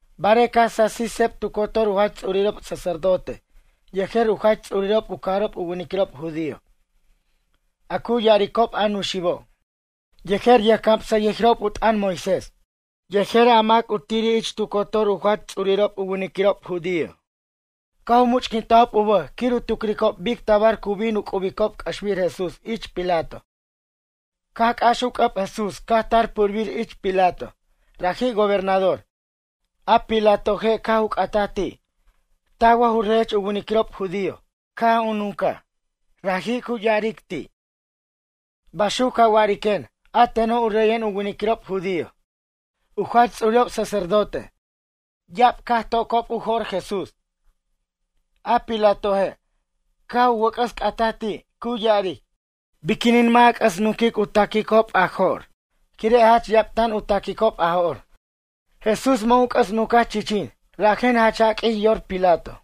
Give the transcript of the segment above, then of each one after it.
Barej caj sasij seb tu cotor u jach ts'urirob sacerdote yejer u jach ts'urirob u cajarob u winiquirob judío, a cu ya'aricob a Nuxibo', yejer yʌjcamsʌyʌjirob u t'ʌn Moisés, yejer a mac t'irir ich tu cotor u jach ts'urirob u winiquirob judío, caj u much'quintajob u bʌj quir u tucricob bic tabar cu bin u c'ubicob c'ʌxbir Jesús ich Pilato. Caj c'ax u c'ʌb Jesús caj tar purbir ich Pilato, raji' gobernador. A Pilatoje' caj u c'ataj ti': ―Taj wa ju reyech u winiquirob judío? Caj u nuncaj raji', cu ya'aric ti': ―Baxuc ca wa'ariquen, a teno' u reyen u winiquirob judío. U jach ts'urirob sacerdote, ya'ab caj u tocob u jo'r Jesús. A Pilatoje', caj u wʌc'ʌs c'ataj ti', cu ya'aric: ―Biquinin mʌ' a c'ʌs nunquic u taquicob a jo'r quire' jach ya'ab tan u taquicob a jo'r? Jesús mʌ' u c'ʌs nuncaj chichin, rajen jach jaq'uij yor Pilato.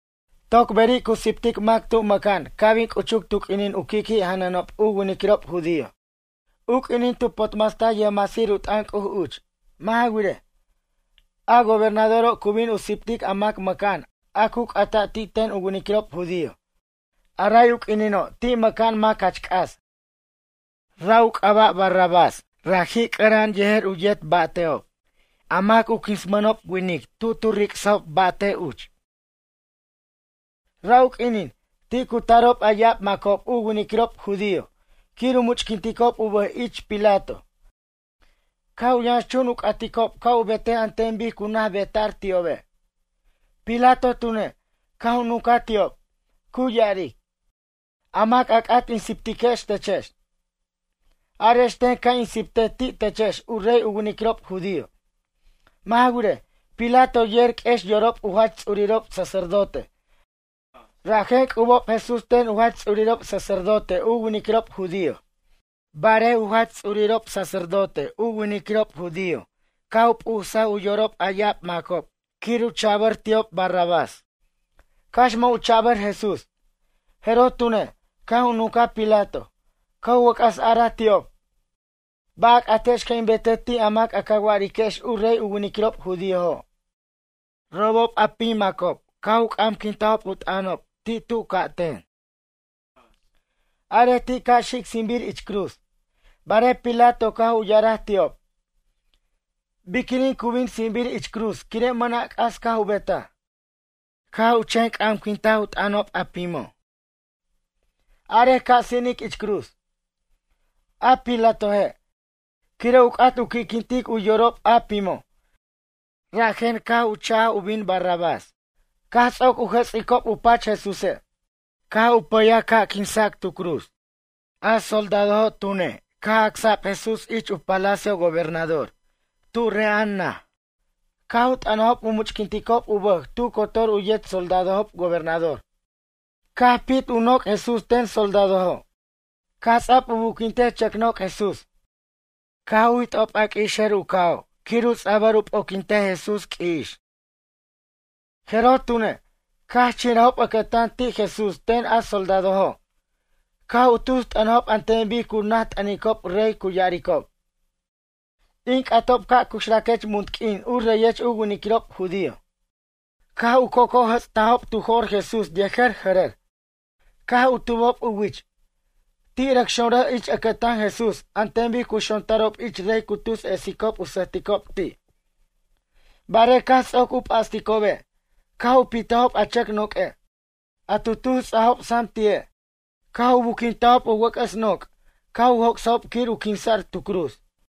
Toc beri' cu siptic mac tub mʌca'an ca' bin c'uchuc tu q'uinin u qui' qui' janʌnob u winiquirob judío, u q'uinin tu potmastaj yʌjmasir u t'ʌn C'uj uch. Mʌ' ja wirej, a gobernadoro' cu bin u siptic a mac mʌca'an a cu c'ata' ti' ten u winiquirob judío. A ray u q'uinino' ti' mʌca'an mac jach c'as. Ra' u c'aba' Barrabás, raji' c'ʌra'an yejer u yet ric's ʌjba'te'ob, mac u quinsmʌnob winic tu tu ric'sajob ba'te' uch. Ra' u quinin, ti' cu tarob a ya'ab macob u winiquirob judío, quir u much'quinticob u bʌj ich Pilato, caj u yʌnxchun u c'aticob ca' u betej an ten bic cu naj beta'r ti'obe'. Pilato tune', caj u nuncaj ti'ob, cu ya'aric: ―A mac a c'at in siptiquex techex? Arex ten ca' in siptej ti' techex u rey u winiquirob judío? Mʌ' ja wirej, Pilato yer q'uex yorob u jach ts'urirob sacerdote, rajen c'ubob Jesús ten u jach ts'urirob sacerdote u winiquirob judío. Barej u jach ts'urirob sacerdote u winiquirob judío caj u p'usaj u yorob a ya'ab macob quir u cha'bʌr ti'ob Barrabás, cax mʌ' u cha'bʌr Jesús. Jeroj tune', caj u nuncaj Pilato, caj u wʌc'ʌs a'araj ti'ob: ―Ba' a c'atex ca' in betej ti' a mac a ca wa'ariquex u rey u winiquirob judíojo'? Robob a pim macob, caj u c'amquintajob t'ʌnob ti' tu ca'ten: ―Arej ti' ca' xic sinbir ich cruz. Barej Pilato caj u ya'araj ti'ob: ―Biquinin cu bin sinbir ich cruz quire' mʌna' c'as caj u betaj? Caj chen c'amquintaj u t'ʌnob a pimo': ―Arej ca' sinic ich cruz. A Pilatoje', quire' u c'at u qui'quintic u yorob a pimo', rajen caj u cha'j u bin Barrabás. Caj ts'oc u jʌts'icob u pach Jesúse', caj u c'u'saj ca' quinsac tu cruz. A soldadojo' tune', caj acsa'b Jesús ich palacio gobernador, tu re'a'an naj. Caj u t'ʌnajob u much'quinticob u bʌj tu cotor u yet soldadojob gobernador. Caj pit u noc' Jesús ten soldadojo', caj ts'a'b u buquintej chʌc noc' Jesús. Caj jit'ob a q'ui'ixer u ca'o' quir u ts'a'bʌr u p'oquintej Jesús q'ui'ix. Jeroj tune', caj chinrajob ʌcʌtan ti' Jesús ten a soldadojo', caj u tus t'ʌnajob an ten bic cu naj t'ʌnicob rey cu ya'aricob: ―In c'atob ca' cuxraquech munt q'uin u reyech u winiquirob judío. Caj u c'oc'ojʌts'tajob tu jo'r Jesús yejer jʌrʌr, caj u tubob u wich. Ti' rʌc xonrʌjob ich ʌcʌtan Jesús an ten bic cu xontarob ich rey cu tus esicob u sʌjticob ti'. Barej caj ts'oc u p'asticobe', caj u pitajob a chʌc noq'ue', a tu tus ts'ajob sam ti'e' caj u buquintajob u wʌc'ʌs noc' caj u joc'sajob quir u quinsa'r tu cruz.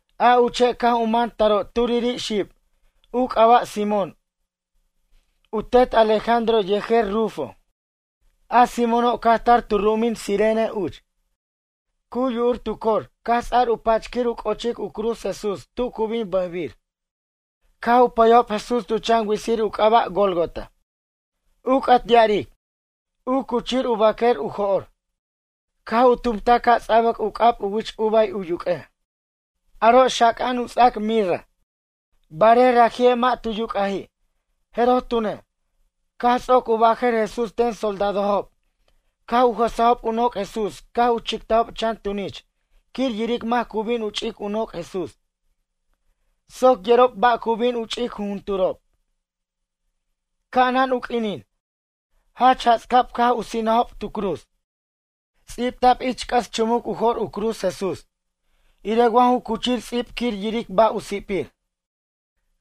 A uche' caj u man taro' turiri' xib, u c'aba' Simón, u tet Alejandro yejer Rufo. A Simóno' caj tar tu ru'umin Cirene uch. Cu yu'ur tu cor caj ts'ar u pach quir u c'o'ochic u cruz Jesús tu cu bin bʌjbir. Caj u pʌyajob Jesús tu chan witsir u c'aba' Gólgota, u c'at ya'aric: U Cuchir U Baquer U Jo'r. Caj u tumtaj ca' ts'abʌc u c'ab u wich uva u yuq'uej, aro' xaca'an u ts'ac mirra, barej raji'e' mʌ' tu yuc'aji'. Jeroj tune', caj ts'oc u bajʌr Jesús ten soldadojob caj u jʌsajob u noc' Jesús caj u chictajob chan tunich quir yiric mac cu bin u ch'ic u noc' Jesús. Soc yerob ba' cu bin ch'ic jujunturob. Ca'anan u q'uinin, jach jats'cab caj u sinajob tu cruz. Ts'ibta'b ich c'ʌs chumuc u jo'r u cruz Jesús, irej wa ju cuchir ts'ib quir yiric ba' u si'pir.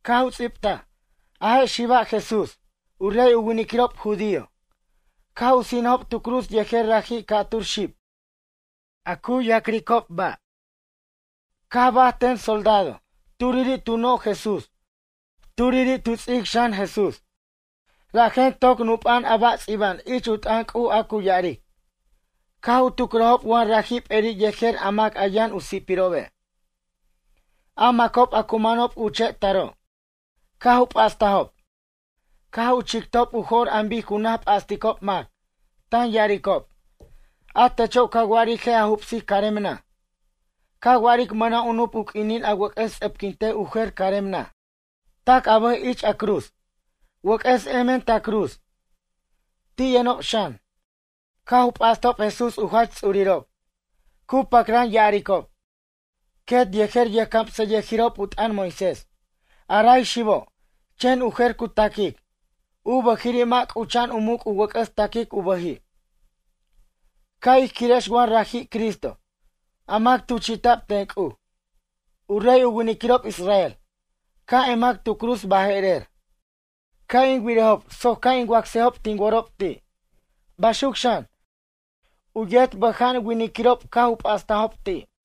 Caj u ts'ibtaj: “A je' xiba' Jesús, u rey u winiquirob judío.” Caj u sinajob tu cruz yejer raji' ca'tur xib, a cu ya'cricob ba'. Caj baj ten soldado. Turiri' tu noj Jesús, turiri' tu ts'ic xan Jesús. Rajen toc nup'a'an a ba' ts'iba'an ich u t'ʌn C'uj a cu ya'aric: “Caj u tucrajob wa raji' p'eri' yejer a mac a yʌn u si'pirobe'.” A macob a cu manob uche' taro', caj u p'astajob, caj u chictob u jo'r an bic cu naj p'asticob mac, tan ya'aricob: ―A techo' ca wa'aric je' a jubsic carem naj, ca wa'aric mʌna' u nup u q'uinin a wʌc'ʌs ts'ʌpquintej u jer carem naj. Tac a bʌj ich a cruz, wʌc'ʌs emen ta cruz. Ti' yʌnob xan, caj u p'astob Jesús u jach ts'urirob, cu pacran ya'aricob, quet yejer yʌjcamsʌyʌjirob u t'ʌn Moisés: ―A ray xibo', chen u jer cu taquic, u bʌjiri' mʌ' c'ucha'an u muc' u wʌc'ʌs taquic u bʌji'. Ca' ij quirex wa raji' Cristo, a mac tuchi'ta'b ten C'uj, u rey u winiquirob Israel. Ca' emac tu cruz baje'rer, ca' in wirejob soc ca' in wacsejob tin worob ti'. Baxuc xan, u yet bʌja'an winiquirob caj u p'astajob ti'.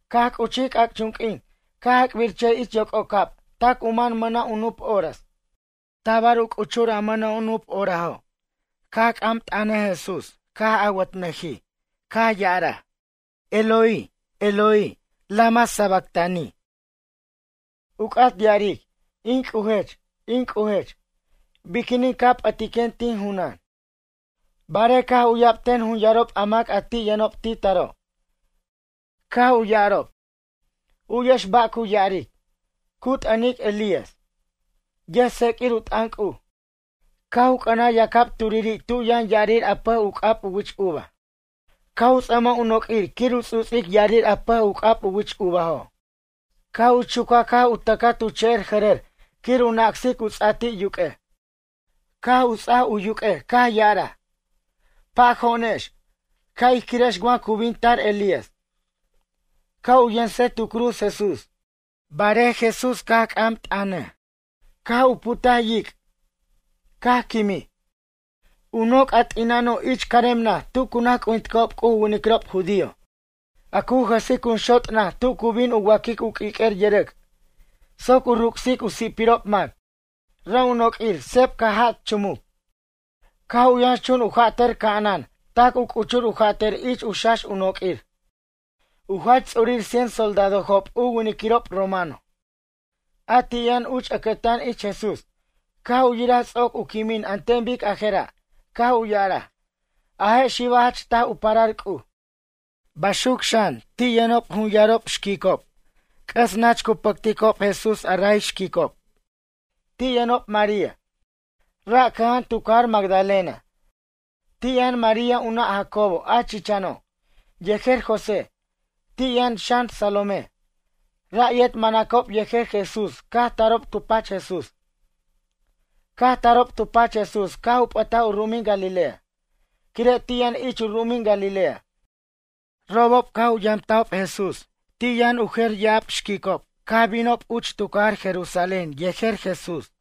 Caj c'uchij c'ac'chun q'uin caj ac'birchʌjij ich yoc'ocab tac u man mʌna' u nup horas. Tabar u c'uchur a mʌna' u nup horaso' caj c'am t'ʌnʌj Jesús caj awʌtnʌjij, caj ya'araj: ―Eloi, Eloi, lama sabactani? ―u c'at ya'aric: In C'ujech, in C'ujech, biquinin ca p'ʌtiquen tin junan? Barej caj u'yab ten jun yarob a mac a ti' yʌnob ti' taro', caj u ya'arob: ―U'yex ba' cu ya'aric. Cu t'ʌnic Elías, yʌjtsequir u t'ʌn C'uj. Caj u c'ʌnaj yacab turiri' tu yʌn ya'arir a pʌj u c'ab u wich uva, caj u ts'ʌmaj u noq'uir quir u ts'uts'ic ya'arir a pʌj u c'ab u wich uvajo'. Caj u chucaj caj u tʌcaj tu che'er jʌrʌr quir u nacsic u ts'a ti' yuq'uej. Caj u ts'aj u yuq'uej caj ya'araj: ―Pajo'onex, ca' ij quirex wa cu bin tar Elías, ca' u yensej tu cruz Jesús. Barej Jesús caj c'am t'ʌnaj, caj u putaj yic', caj quimij. U noc' a t'ina'ano' ich carem naj tu cu naj c'ujinticob C'uj u winiquirob judío, a cu jʌsic jun xot' naj tu cu bin u wa'quic u q'uiq'uer yʌrʌc' soc u ruc'sic u si'pirob mac. Ra' u noq'uir seb caj jat chumuc. Caj u yʌnxchun u jatʌr ca'anan tac u c'uchur u jatʌr ich u xax u noq'uir. U jach ts'urir cien soldadojob u winiquirob romano, a ti' yʌn uch ʌcʌtan ich Jesús, caj u yiraj ts'oc u quimin an ten bic a jera', caj u ya'araj: ―A je' xiba' jach taj u parar C'uj. Baxuc xan, ti' yʌnob jun yarob xquicob, c'ʌs nach cu pʌcticob Jesús a ray xquicob. Ti' yʌnob María, ra' cʌja'an tu cajar Magadalena, ti' yʌn María u nʌ' Jacobo a chichano', yejer José, ti' yʌn xan Salomé. Ra' yet manacob yejer Jesús caj tarob tu pach Jesús. Caj tarob tu pach Jesús caj u p'ʌtaj u ru'umin Galilea. Quire' ti' yʌn ich u ru'umin Galilea. Robob caj u yamtajob Jesús, ti' yʌn u jer ya'ab xquicob caj binob uch tu cajar Jerusalén yejer Jesús.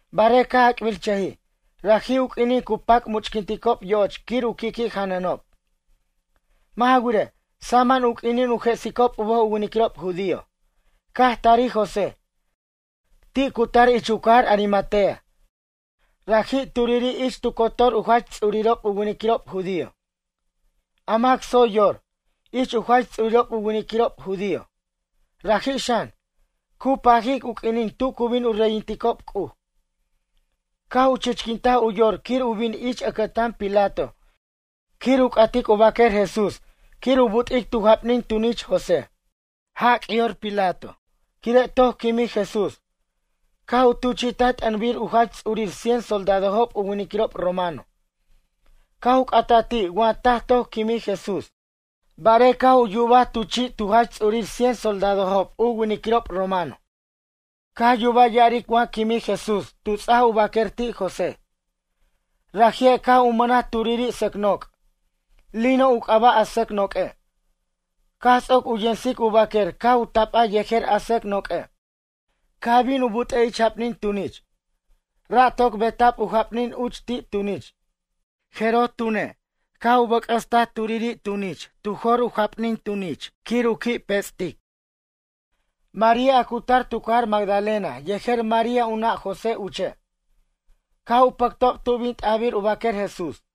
Barej caj ac'birchʌjij, raji' u q'uinin cu pac much'quinticob yo'och quir u qui' qui' janʌnob. Mʌ' ja wirej, saman u q'uinin u jesicob u bʌj u winiquirob judío. Caj tarij José, ti' cu tar ich u cajar Arimatea, raji' turiri' ich tu cotor u jach ts'urirob u winiquirob judío, a mac tsoy yor, ich u jach ts'urirob u winiquirob judío. Raji' xan, cu pajic u q'uinin tu cu bin u reyinticob C'uj. Caj u chichquintaj u yor quir u bin ich ʌcʌtan Pilato quir u c'atic u baquer Jesús quir u but'ic tu japnin tunich José. Jac' yor Pilato, quire' toc quimij Jesús, caj u tuchi'taj t'ʌnbir u jach ts'urir cien soldadojob u winiquirob romano, caj u c'ataj ti' wa taj toc quimij Jesús. Barej caj u yubaj tu chi' tu jach ts'urir cien soldadojob u winiquirob romano, caj yubaj ya'aric wa quimij Jesús tu ts'aj u baquer ti' José. Raji'e' caj u mʌnaj turiri' sʌc noc', lino u c'aba' a sʌc noq'ue', caj ts'oc u yensic u baquer caj u tapaj yejer a sʌc noq'ue', caj bin u but'ej ich japnin tunich, ra' toc beta'b u japnin uch ti' tunich. Jeroj tune', caj u bʌc'ʌstaj turiri' tunich tu jor u japnin tunich quir u qui' pe'che'tic. María a cu tar tu cajar Magdalena yejer María u nʌ' José uche', caj u pʌctob tu bin t'ajbir u baquer Jesús.